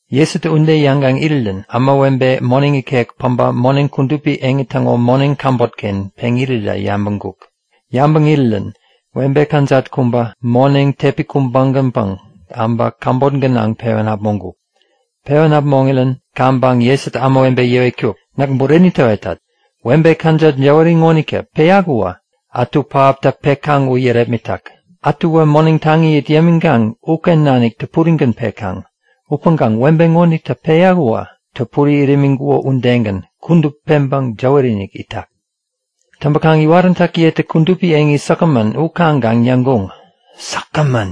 Jesutä ude yäŋkaŋ irirän ämawebe moneŋ ikek päbä moneŋi kudupi eŋi täŋo moneŋ käbot-ken peŋ irirä yabäŋkuk. Yabäŋ irirän webe kajat kubä moneŋ tepi kubägänpäŋ äbä käbot gänaŋ pewän äpmoŋkuŋ. Pewän äpmoŋirän kaŋpäŋ Jesutä ämawebe yäwetkuk; Näk bureni täwetat; Webe kajat jäwäri ŋonitä peyak uwä ätu pähaptä pekaŋ u yärepmitak. Ätuwä moneŋ taŋi it yämikaŋ uken nanik täpurigän pekaŋ. Upäŋkaŋ webe ŋonitä peyak uwä täpuri it imiŋkuko udegän, kudup peŋpäŋ jäwäri-inik itak. Täŋpäkaŋ iwaräntäkiyetä kudupi eŋi säkgämän u kaŋkaŋ yäŋkuŋ; Säkgämän!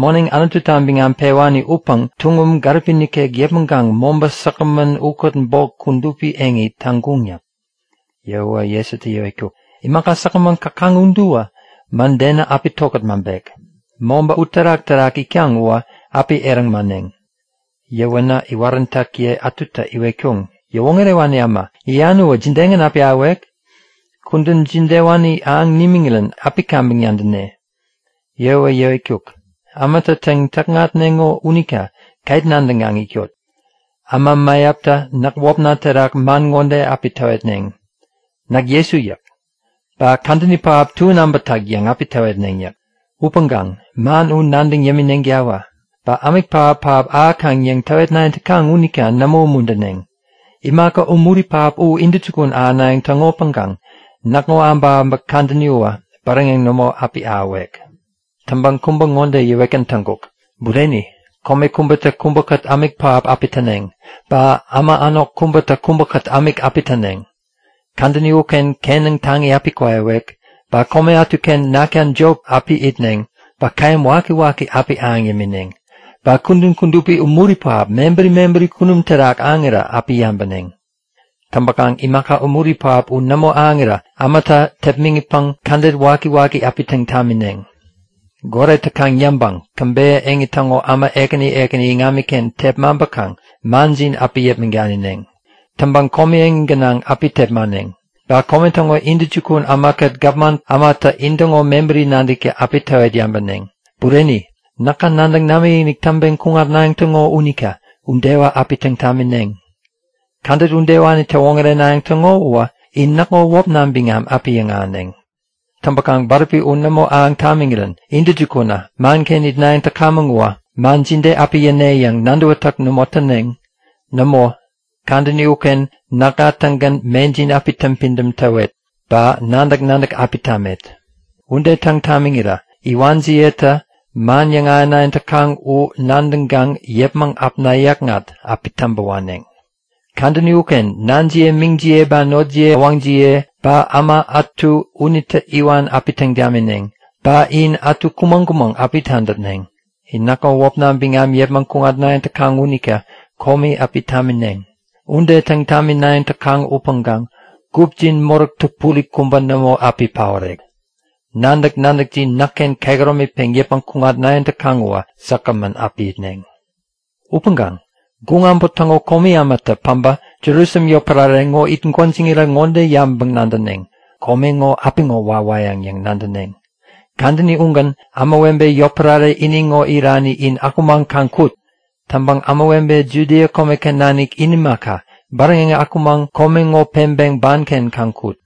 Moneŋ Anututa biŋam pewani upäŋ tuŋum gäripi nikek yäpmäŋkaŋ mobä säkgämän ukät bok kudupi eŋi täŋkuŋ yäk. Yäwäwä Jesutä yäwetkuk; Imaka säkgämän käkaŋ uduwä mädenä api tokät maŋpek. Mobä uterak-terak itkaŋ uwä api eräŋ mäneŋ. Yäwänä iwaräntäkiye ätutä iwetkuŋ; Yäwoŋärewani äma, yäyan uwä jidegän api ahäwek? Kudän jidewani ahäŋ nimiŋirän api kaŋpäŋ nadäne? Yäwäwä yäwetkuk; Ämatä täŋ-täkŋatneŋo unita ket nadäŋkaŋ itkot. Äma mäyaptä näk wäpna terak man ŋode api täwetneŋ; Näk Jesu yäk. Ba kadäni pähap tuän äbätak yäŋ api täwetneŋ yäk. Upäŋkaŋ man u nadäŋ yämineŋtawä. Ba ämik pähap-pähap ahäkaŋ yäŋ täwetnayäŋ täkaŋ unita nämo umuntäneŋ. Imaka umuri pähap u intäjukun ahänayäŋ täŋopäŋkaŋ näkŋo äbäkäbäk kadäni uwä bäräŋeŋ nämo api ahäwek. Täŋkaŋ kubä ŋode yäwetgän täŋkuk; Bureni, kome kubätä kubäkät ämik pähap api täneŋ. Ba äma änok kubätä kubäkät ämik api täneŋ. Kadäni uken kenäŋ taŋi api kwaiwek. Ba kome ätuken nakta jop api itneŋ ba käyäm wakiwaki api ahäŋ yämineŋ. Ba kudän kudupi umuri pähap mebäri mebäri kunum terak ahäŋirä api yabäneŋ. Täŋpäkaŋ imaka umuri pähap u nämo ahäŋirä ämatä tepmäŋitpäŋ kädet wakiwaki api täŋ tamineŋ. Goret täkaŋ yäŋpäŋ käbeyä eŋi täŋo äma ekäni ekäni iŋamiken tepmaŋpäkaŋ manjin api yäpmäŋ danineŋ. Täŋpäŋ komi eŋi gänaŋ api tepmaneŋ. Ba kome täŋo intäjukun ämakät gapman ämatä intäŋo mebäri nadäkta api täwet yabäneŋ. Bureni, näka nadäŋ namikinik täŋpeŋ kuŋatnayäŋ täŋo unita udewä api täŋ tamineŋ. Kädet udewani täwoŋärenayäŋ täŋo uwä in näkŋo wäpna biŋam api yäŋahäneŋ. Täŋpäkaŋ bäräpi u nämo ahäŋ tamiŋirän intäjukunä manken itnayäŋ täkamäŋ uwä man jide api yäne yäŋ nadäwätäk nämo täneŋ. Nämo, kadäni uken näkŋa-tägän mejin api täŋpidäm täwet ba nadäk-nadäk api tamet. Ude täŋ tamiŋira iwanjiyetä man yäŋahänayäŋ täkaŋ u nadäŋkaŋ yäpmäŋ äpna yäkŋat api täŋpä waneŋ. Kadäni uken nanjiye meŋjiye ba notjiye äwäŋjiye ba äma ätu unitä iwan api täŋ tamineŋ. Ba in ätu kumäŋ-kumäŋ api tadäpneŋ. In näkŋo wäpna biŋam yäpmäŋ kuŋatnayäŋ täkaŋ unita komi api tamineŋ. Ude täŋ taminayäŋ täkaŋ upäŋkaŋ gupjin moräk täpuri kubä nämo api paorek. Nadäk-nadäkjin näkken kehäromi peŋ yäpmäŋ kuŋatnayäŋ täkaŋ uwä säkgämän api itneŋ. Upäŋkaŋ guŋ äbot täŋo komi ämatä päbä Jerusalem yotpärare ŋo it gwäjiŋirä ŋode yabäŋpäŋ-nadäneŋ; Kome ŋo apiŋo wawayäŋ yäŋ nadäneŋ. Kadäni ugän ämawebe yotpärare ini ŋo irani in akumaŋ kaŋ kut. Täŋpäŋ ämawebe Judia komeken nanik u imaka, bäräŋeŋ akumaŋ kome ŋo peŋpeŋ banken kaŋ kut.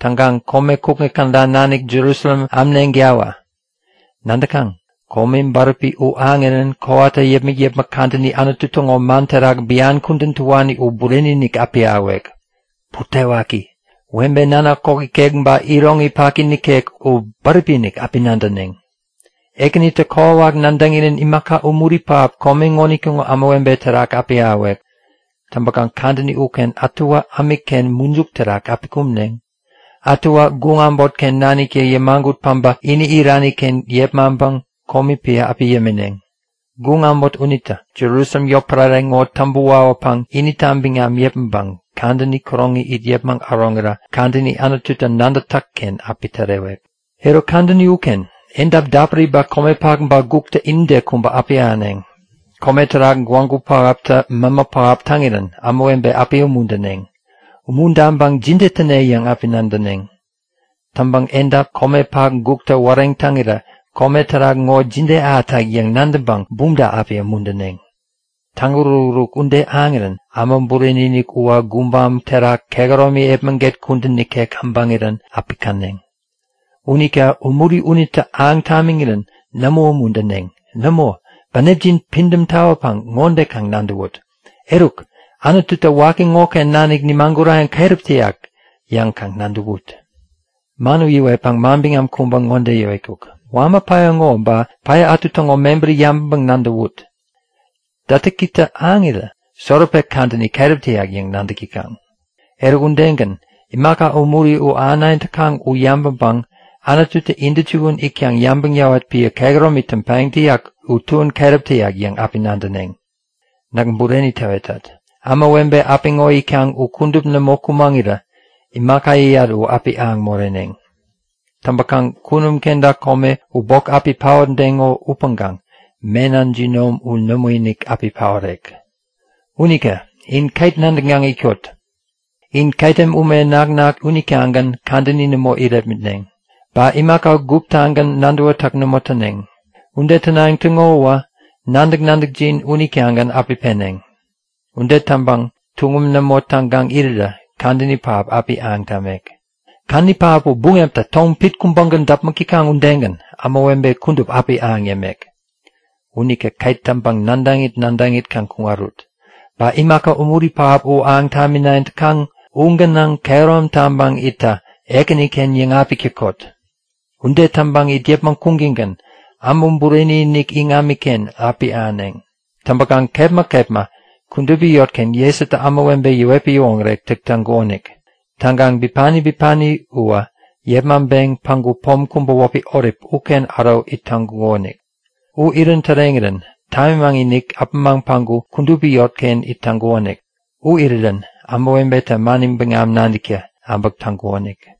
Täŋkaŋ kome kukŋi käda nanik Jerusalem amneŋtawä! Nadäkaŋ? Komi bäräpi u ahäŋirän kowata yäpmäk-yäpmäk kadäni Anutu täŋo man terak bian kudän täwani u bureni-inik api ahäwek. Butewaki! Webe nanak kok ikek ba iroŋi paki nikek u bäräpi-inik api nadäneŋ! Ekänitä kokwawak nadäŋirän imaka umuri pähap kome ŋonitäŋo ämawebe terak api ahäwek. Täŋpäkaŋ kadäni uken ätuwä ämikken mujuk terak api kumneŋ. Ätuwä guŋ äbotken naniktä yämagut päŋku ini irani-ken yepmaŋpäŋ komi piä api yämineŋ. Guŋ äbot unitä Jerusalem yotpärare ŋo täŋpä wawäpäŋ inita biŋam yäpmäŋpäŋ kadäni käroŋi it yäpmäŋ äroŋirä kadäni Anututä nadätak-ken api tärewek. Eruk, kadäni uken edap dapuri ba komepak ba guktä inide kubä api ahäneŋ. Kome terak gwägu pähaptä mämä pähap täŋirän ämawebe api umuntäneŋ. Umuntaŋpäŋ jide täne yäŋ api nadäneŋ. Täŋpäŋ edap, komepak guktä wareŋ täŋirä kome terak ŋo jide ahätak yäŋ nadäŋpäŋ bumta api umuntäneŋ. Täŋuruk-uruk ude ahäŋirän Äma Bureni-inik uwä gubam terak kehäromi epmäget kudän nikek abäŋirän api käneŋ. Unita umuri unitä ahäŋ tamiŋirän nämo umuntäneŋ. Nämo, bänepjin pidäm tawäpäŋ ŋode kaŋ nadäwut; Eruk, Anututä waki ŋoken nanik nimagurayäŋ keräp täyak yäŋ kaŋ nadäwut. Man u yäwetpäŋ manbiŋam kubä ŋode yäwetkuk; Wama päya ŋo ba päya ätu täŋo mebäri yabäŋpäŋ-nadäwut. Dätäkitä ahäŋirä Soropek kadäni keräp täyak yäŋ nadäk täkaŋ. Eruk, udegän imaka umuri u ahänayäŋ täkaŋ u yabäŋpäŋ Anututä intäjukun itkaŋ yabäŋ yäwat piä kehäromi täŋpayäŋ täyak u tuän keräp täyak yäŋ api nadäneŋ. Näk bureni täwetat; Ämawebe apiŋo itkaŋ u kudup nämo kumäŋirä imaka yäyat u api ahäŋ moreneŋ. Täŋpäkaŋ kunum kenta kome u bok api paotdeŋo upäŋkaŋ mena jinom u nämoinik api paorek. Unita in ket nadäŋkaŋ itkot! In ketem ume naknak unitagän kadäni nämo irepmitneŋ. Ba imaka guptagän nadäwätäk nämo täneŋ. Ude tänayäŋ täŋo uwä nadäk-nadäkjin unitagän api peneŋ. Ude täŋpäŋ tuŋum nämo täŋkaŋ irirä kadäni pähap api ahäŋ tamek. Kadäni pähap u buŋeptä tom pit kubägän däpmäk täkaŋ udegän ämawebe kudup api ahäŋ yämek. Unita ket täŋpäŋ nadäŋit nadäŋit kaŋ kuŋarut. Ba imaka umuri pähap u ahäŋ taminayäŋ täkaŋ u gänaŋ kehärom taŋpäŋ itta Ekäniken yäŋapik täkot. Ude täŋpäŋ it yäpmäŋ kuŋtäŋgän Äma Bureni-inik iŋamiken api ahäneŋ. Täŋpäkaŋ kepma kepma kudupi yotken Jesutä ämawebe yäwetpäŋ yäwoŋärek täk täŋkukonik. Täŋkaŋ bipani bipani uwä yepmaŋpeŋ päŋku pom kubä wäpi Olip uken äro it täŋkukonik. U irän täreŋirän tamimaŋ-inik apämaŋ päŋku kudupi yotken it täŋkukonik. U irirän ämawebetä mani biŋam nadäkta äbäk täŋkuŋonik.